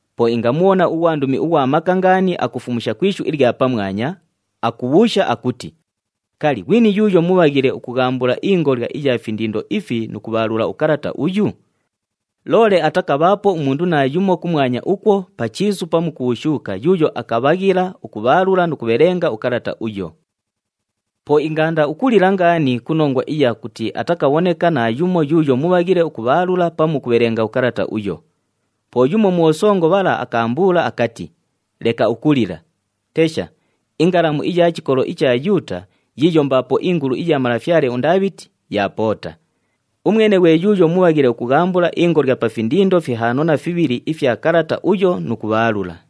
Po ingamubhona ughwandumi ughwa maka ngaani akufumusha ku ishu ilya pamwanya, akubhuusha akuti, “Kali, ghwini yuuyo mubhaghile ukughambula ingolya iya findindo ifi nu kubhaalula ukalata uyu?” Loole atakabhaapo umundu naayumo kumwanya ukwo, pa chiisu pamu ku bhushuuka yuuyo akabhaghila ukubhaalula nu kubhelenga ukalata uyo. Po ingaanda ukulila ngaani ku nongwa iya kuti atakabhoneka naayumo yuuyo mubhaghile ukubhaalula pamu ukubhelenga ukalata uyo. Po yumo mu bhosongo bhala akaambuula akati, “Leka ukulila! Tesha! INgalamu iya chikolo icha Yuuta, yiiyo mbaapo ingulu iya malafyale uNdaabhiti, yaapoota. Umwene ghwe yuuyo mubhaghile ukughambula ingolya pa findindo fihaano na fibhili ifya kalata uyo nu kubhaalula.”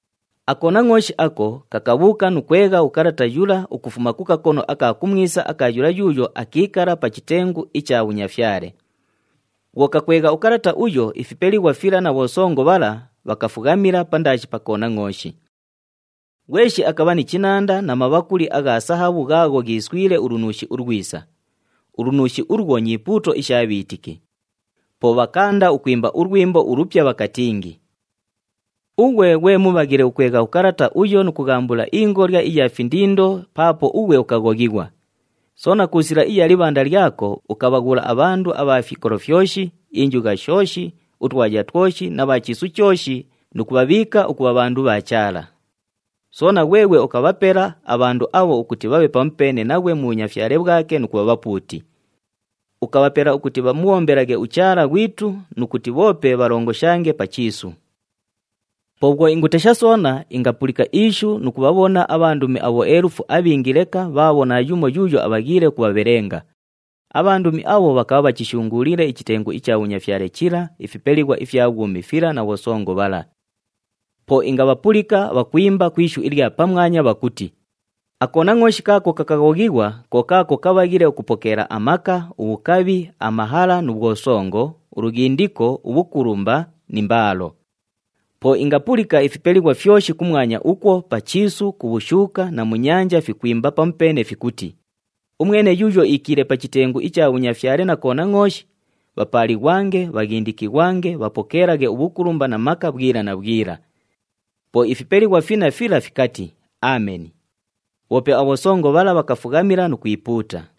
AKonangʼooshi ako, kakabhuuka nu kwegha ukalata yula ukufuma ku kakono aka kumwisa aka yula yuuyo akiikala pa chitengu icha bhunyafyale. Bhwo kakwegha ukalata uyo, ifipelighwa fila na bhosongo bhala, bhakafughamila pandaashi pa Konangʼooshi. Ghweshi akabha ni chinanda na mabhakuli agha sahabhu ghaagho ghiiswile ulunuushi ulwisa. Ulunuushi ulwo nyipuuto isha bhiitiki. Po bhakaanda ukwimba ulwimbo ulupya bhakatingi, “Ughwe ghwe mubhaghile ukwegha ukalata uyo nu kughambula ingolya iya findindo paapo ughwe ukaghoghighwa. Soona ku sila iya libhanda lyako, ukabhaghula abhandu abha fikolo fyoshi, injugha shooshi, utwaya twoshi na bha chiisu chooshi, nu kubhabhiika ukubha bhandu bha Chaala. Soona, ghweghwe ukabhapela abhandu abho ukuti bhabhe pamupeene naghwe mu bhunyafyale bhwake nu kubha bhapuuti. Ukabhapela ukuti bhamubhombelaghe uChaala ghwitu, nu kuti bhoope bhalongoshange pa chiisu.” Po bhwo ingutesha soona, ingapulika ishu nu kubhabhona abhandumi abhoelufu abhingi leka bhaabho naayumo yuuyo abhaghiile ukubhabhelenga. Abhandumi abho bhakabha bhachishunguuliile ichitengu icha bhunyafyale chila, ifipelighwa ifya bhwumi fila na bhosongo bhala. Po ingabhapulika bhakwimba ku ishu ilya pamwanya, bhakuti, “AKonangʼooshi kaako kakaghoghighwa, ko kaako kabhaghile ukupokeela amaka, ubhukabhi, amahala nu bhwosongo, ulughindiko, ubhukulumba ni mbaalo!” Po ingapulika ifipelighwa fyoshi kumwanya ukwo, pa chiisu, ku bhushuuka na mu nyanja, fikwimba pamupeene fikuti, “Umwene yuuyo iikiile pa chitengu icha bhunyafyale na Konangʼooshi, bhapaalighwange, bhaghindikighwange, bhapokeelaghe ubhukulumba na maka bhwila na bhwila!” Po ifipelighwa finna fila fikati, “Ameni!” Bhoope abhosongo bhala bhakafughamila nu kwipuuta.